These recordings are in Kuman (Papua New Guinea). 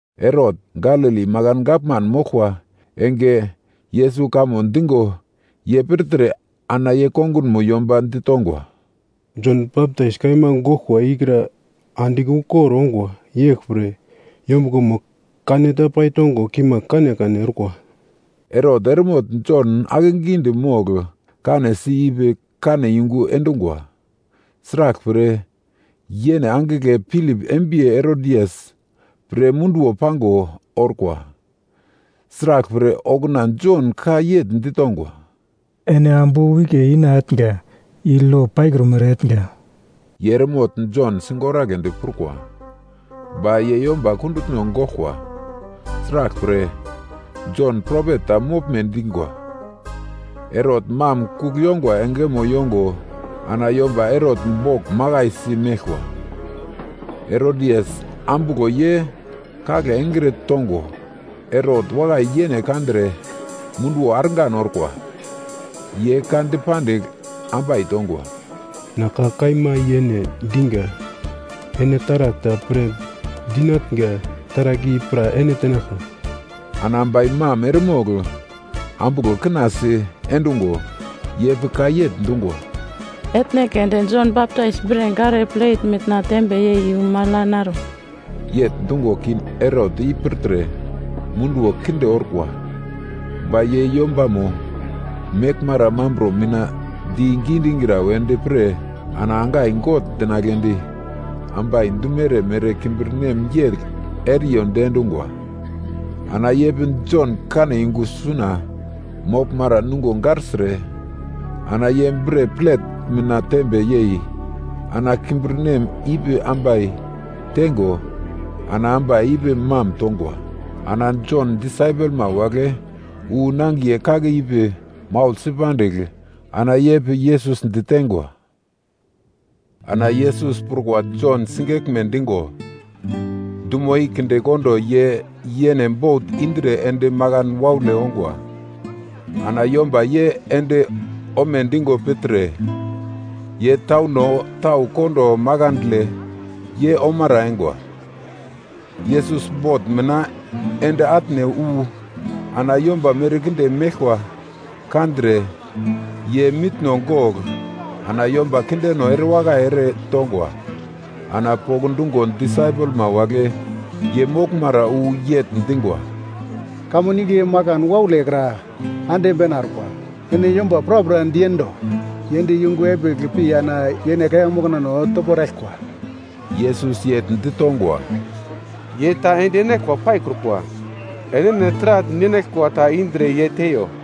Herot, Galili makan gavman moglkwa enge Yesus kamo digo ye pirtre, ana ye kongunmo yomba ditongwa, “Jon Baptais kaima goglkwa ikra andigl ukor ongwa, yeglpre, yombuglomo kaneta paitongo kimagl kanekane orkwa.” Herot eremogl Jon akegidi mogl kanesi ipi kane yungu endungwa. Sraglpre yene angigle Pilip embiye Herodias pre munduwo pango orkwa. Sraglpre okuna Jon ka yegl ditongwa, “Ene ambu wike ina etnga i lo paikrumere etnga.” Ye eremogl Jon sigoragledi prukwa, ba ye yomba kundutno goglkwa, sraglpre, Jon propet ta moglme dingwa. Herot mam kugl yongwa engemo yongo ana yomba Herot bogl makaisi meglkwa. Herodias ambuglo ye kagle engre tongo, Herot wakai yene kandre munduwo argan orkwa. Ye ka dipandigl ambai tongwa, “Na ka kaima yene digi, ene taragl ta pre dinatnga, taragl i pra ene tenaglka.” Ana ambai mam eremogl ambuglo kina si endungo ye pi ka yegl dungwa, “Etne keunde Jon Baptais bre gare plet mina tembe yei iyu magl ya naro.” Yegl dungo king Herot i pirtre munduwo kinde orkwa, ba ye yombamo meglmara mambro mina digi digra wedi pre ana angai gogl dinagledi ambai dumere mere kimbirnem yegl eriyo diendungwa. Ana ye pi Jon kane yungu suna moglmara nungo garsire ana ye bre plet mina tembe yei, ana kimbirnem ipi ambai teingo ana ambai ipi mam tongwa. Ana Jon disaipelma wagle wu nangiye kake ipi maugl si pandigl, ana ye pi Yesus diteingwa. Ana Yesus prukwa Jon sigeglme digo, dumo i kindekondo ye yene bot indre ende makan waule ongwa. Ana yomba ye ende omedigo pirtre, ye tauno tau kondo makandle ye omara eingwa. Yesus bot mina ende atne wu, ana yomba merkinde meglkwa kandre, ye mitno gogl ana yomba kindeno erewakai ere tongwa. Ana pokndungo disaipelma wagle ye moglmara wu yegl dingwa, “Kamun igle makan waule kra ande bena orkwa. Ene yomba prapra diendo, ye ende yungu epigl pi ana yene kaiya moknano topo eraglkwa.” Yesus yegl ditongwa, “Ye ta ende enaglkwa paikrukwa. Enene taragl ninaglkwa ta indre ye teiyo.”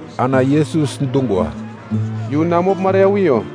Ana Yesus dungwa, “Yu na moglmara ya wiyo.”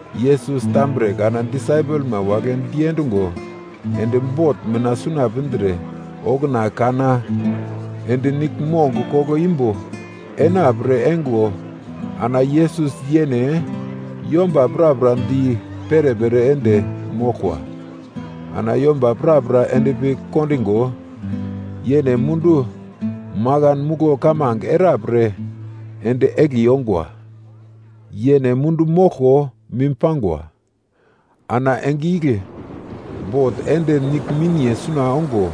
Yesus tambre kana disaipelma wagle diendungo ende bot mina suna pindre okuna kana ende nigl mongo koglo imbo enapre eingo ana Yesus yene yomba prapra di perepere ende moglkwa. Ana yomba prapra endpi kondigo, yene mundu makan muglo kamange era pre ende egli ongwa. Yene mundu moglko mim pangwa. Ana enge igle bot ende nigle miniye suna ongo,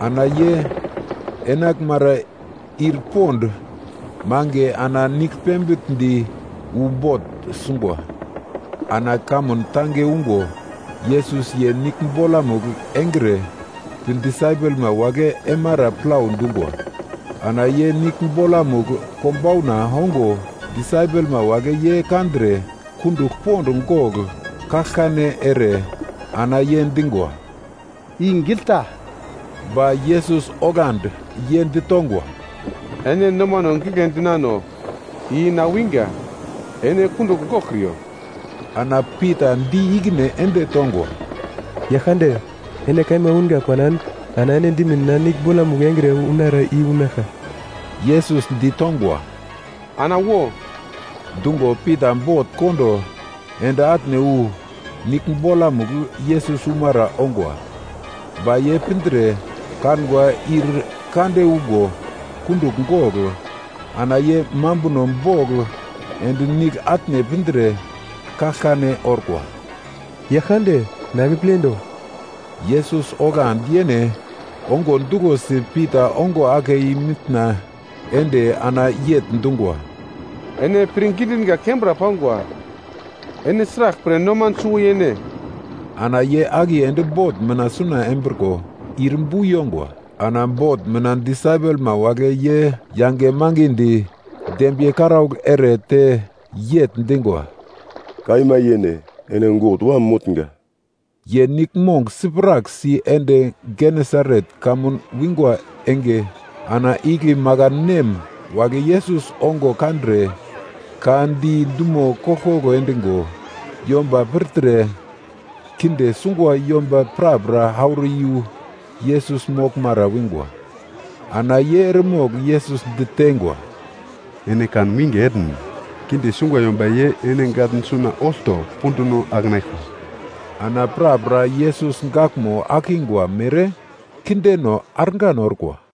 ana ye enaglmara ir pond mange ana nigl pembigl di wu bot sungwa. Ana kamun tange ungo, Yesus ye nigl bolamugl engre pi disaipelma wagle eimara plau dungwa. Ana ye nigl bolamugl konbauna ongo disaipelma wagle ye kandre, kundugl pond gogl kaglkane ere ana ye dingwa, “I gigl ta!” Ba Yesus oglandi ye ditongwa, “Ene nomano gigle dinano. I na winga. Ene kundugl goglkriyo.” Ana Pita di ikine ende tongwa, “Yaglkande, ene kaima unga panan, ana ene dimin na nigl bolamugl engre unara i unaglka.” Yesus ditongwa, “Ana wo!” Dungo Pita bot kondo ende atne wu nigl bolamugl Yesus umara ongwa. Ba ye pindre kangwa ir kande ungo kundugl gogl, ana ye mambuno bogl ende nigl atne pindre kaglkane orkwa, “Yaglkande, na akepledo!” Yesus oglandi yene ongo duglosi Pita ongo ake i-mitna ende ana yegl dungwa, “Ene pirngi dinga kembra pangwa ene sraglpre noman suwo yene?” Ana ye akiye ende bot mina suna embriko ir bu yongwa. Ana bot mina disaipelma wagle ye yange mangidi dembiye karaugl ere te yegl dingwa, “Kaima yene ene God Wam motnga.” Ye niglmong siprak si ende Genesaret kamun wingwa enge, ana igle makan nem wagle Yesus ongo kandre, ka di dumo koglkoglo endigo, yomba pirtre kinde sungwa yomba prapra auro iyu Yesus moglmara wingwa. Ana ye eremogl Yesus diteingwa, “Ene kan winge etn, kinde sungwa yomba ye ene gatn suna olto punduno akenaglkwa.” Ana prapra Yesus gaglmo akingwa mere kindeno argan orkwa.